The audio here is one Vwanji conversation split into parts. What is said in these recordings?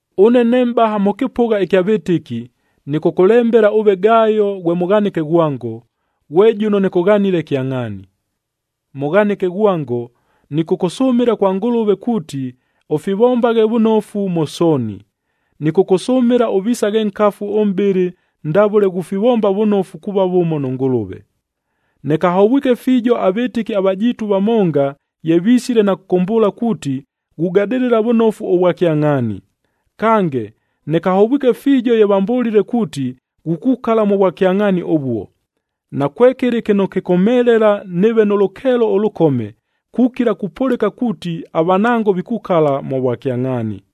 Ʉne ne mʼbaha mʉ kɨpʉgha ɨkya vɨtɨki, nɨkʉkʉlembela ʉve Gayo ghwe mʉghanɨke ghwango, ghwe jʉno nɨkʉghanile kyangʼhaani. Mʉghanɨke ghwango, nɨkʉkʉsʉmɨla kwa Ngʉlʉve kuuti, ʉfivombaghe vʉnofu mʉ sooni. Nɨkʉkʉsʉmɨla ʉvisaghe nkafu ʉmʼbɨlɨ ndavʉle ghufivomba vʉnofu kuuva vʉmo nʉ Ngʉlʉve. Nɨkahovwike fiijo avɨtɨki avajiitu vamonga ye visile na kʉkʉmbʉʉla kuuti, ghugadɨlɨla vʉnofu ʉvwakyangʼhaani. Kange, nɨkahovwike fiijo ye vambʉlile kuuti, ghukukala mʉ vwakyangʼhaani ʉvuo. Nakwekɨlɨ kɨno kɨkʉmhelela nɨɨve nʉ lʉkeelo ʉlʉkome, kukila kupʉlɨka kuuti avanango vikukala mʉ vwakyangʼhaani.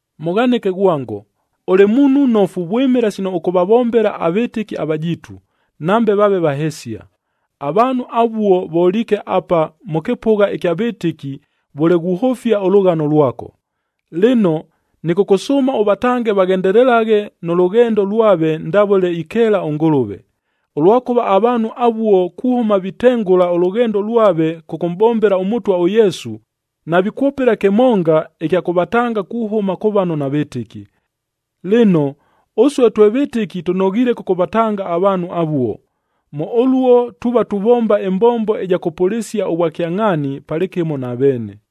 Mʉghanɨke ghwango, ʉlɨ muunhu nnofu vwɨmɨla sino ʉkʉvavombela avɨtɨki avajiitu, nambe vaave vahesia. Avaanhu avuo voliike apa mʉ kɨpʉgha ɨkya vɨtɨki vʉle ghuhʉfia ʉlʉghano lwako. Lɨno, nɨkʉkʉsʉʉma ʉvatange vaghendelelaghe nʉ lʉghendo lwave ndavʉle ikeela ʉNgʉlʉve. Ʉlwakʉva avaanhu avuo kuhʉma vitengʉla ʉlʉghendo lwave kʉkʉmʼbombela ʉMʉtwa ʉYesu, navikwʉpɨla kɨmonga ɨkya kʉvatanga kuhʉma kʉ vano navɨtɨki. Lɨno, ʉsue twe vɨtɨki tʉnoghiile kʉkʉvatanga avaanhu avuo. Mʉ ʉluo tuuva tuvomba ɨmbombo ɨja kʉpʉlɨsia ʉvwakyangʼhaani palɨkɨmo na veene.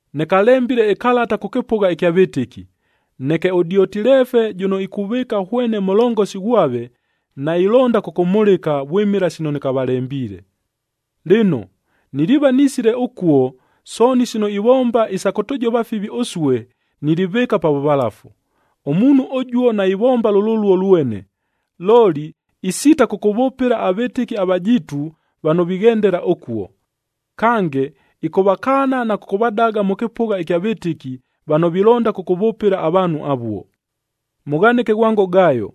Nɨkalembile ɨkalata kʉ kɨpʉgha ɨkya vɨtɨki, neke ʉDiotilefe jʉno ikuvɨɨka hwene mʉlongosi ghwave, nailonda kʉkʉmhʉlɨka vwɨmɨla sino nɨkavalembiile. Lɨno, niliiva nisile ʉkuo, sooni sino ivomba isa kʉtʉjova fivi ʉsue, nilivɨɨka pa vʉvalafu. Ʉmuunhu ʉjuo naivomba lʉluo lwene, looli isiita kʉkʉvʉpɨla avɨtɨki avajiitu vano vighendela ʉkuo. Kange, ɨkʉvakaana na kʉkʉvadaga mʉ kɨpʉgha ɨkya vɨtɨki vano vilonda kʉkʉvʉpɨla avaanhu avuo. Mʉghanɨke ghwango Gayo,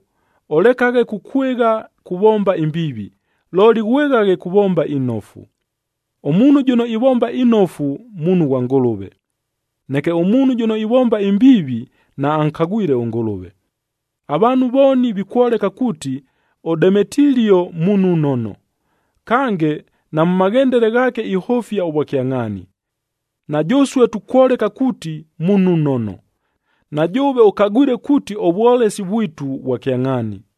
ʉlekaghe kukwɨgha kuvomba imbiivi, looli ghwɨghaghe kuvomba inofu. Ʉmuunhu jʉno ivomba inofu, muunhu ghwa Ngʉlʉve. Neke ʉmuunhu jʉno ivomba imbiivi, naankagwile ʉNgʉlʉve. Avaanhu vooni vikwoleka kuuti, ʉDemetilio muunhu nnono. Kange, na mʉ maghendele ghaake ihʉfia ʉvwakyangʼhaani. Na jʉsue tukwoleka kuuti muunhu nnono, na jʉʉve ʉkagwile kuuti ʉvwolesi vwitu vwa kyangʼhaani.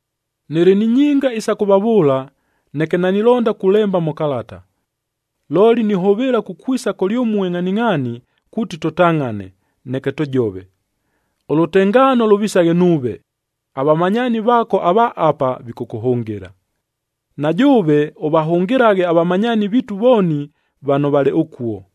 Nɨlɨ ni nyinga isa kʉvavʉʉla, neke nanilonda kulemba mʉ kalata. Looli nihʉvɨɨla kukwisa kʉlyʉmue ngʼhaningʼhaani kuuti tʉtangʼhane, neke tʉjove. Ʉlʉtengaano lʉvisaghe nuuve. Avamanyaani vaako ava apa, vikʉkʉhʉngɨla. Na jʉʉve, ʉvahʉngɨlaghe avamanyaani viitu vooni vano valɨ ʉkuo.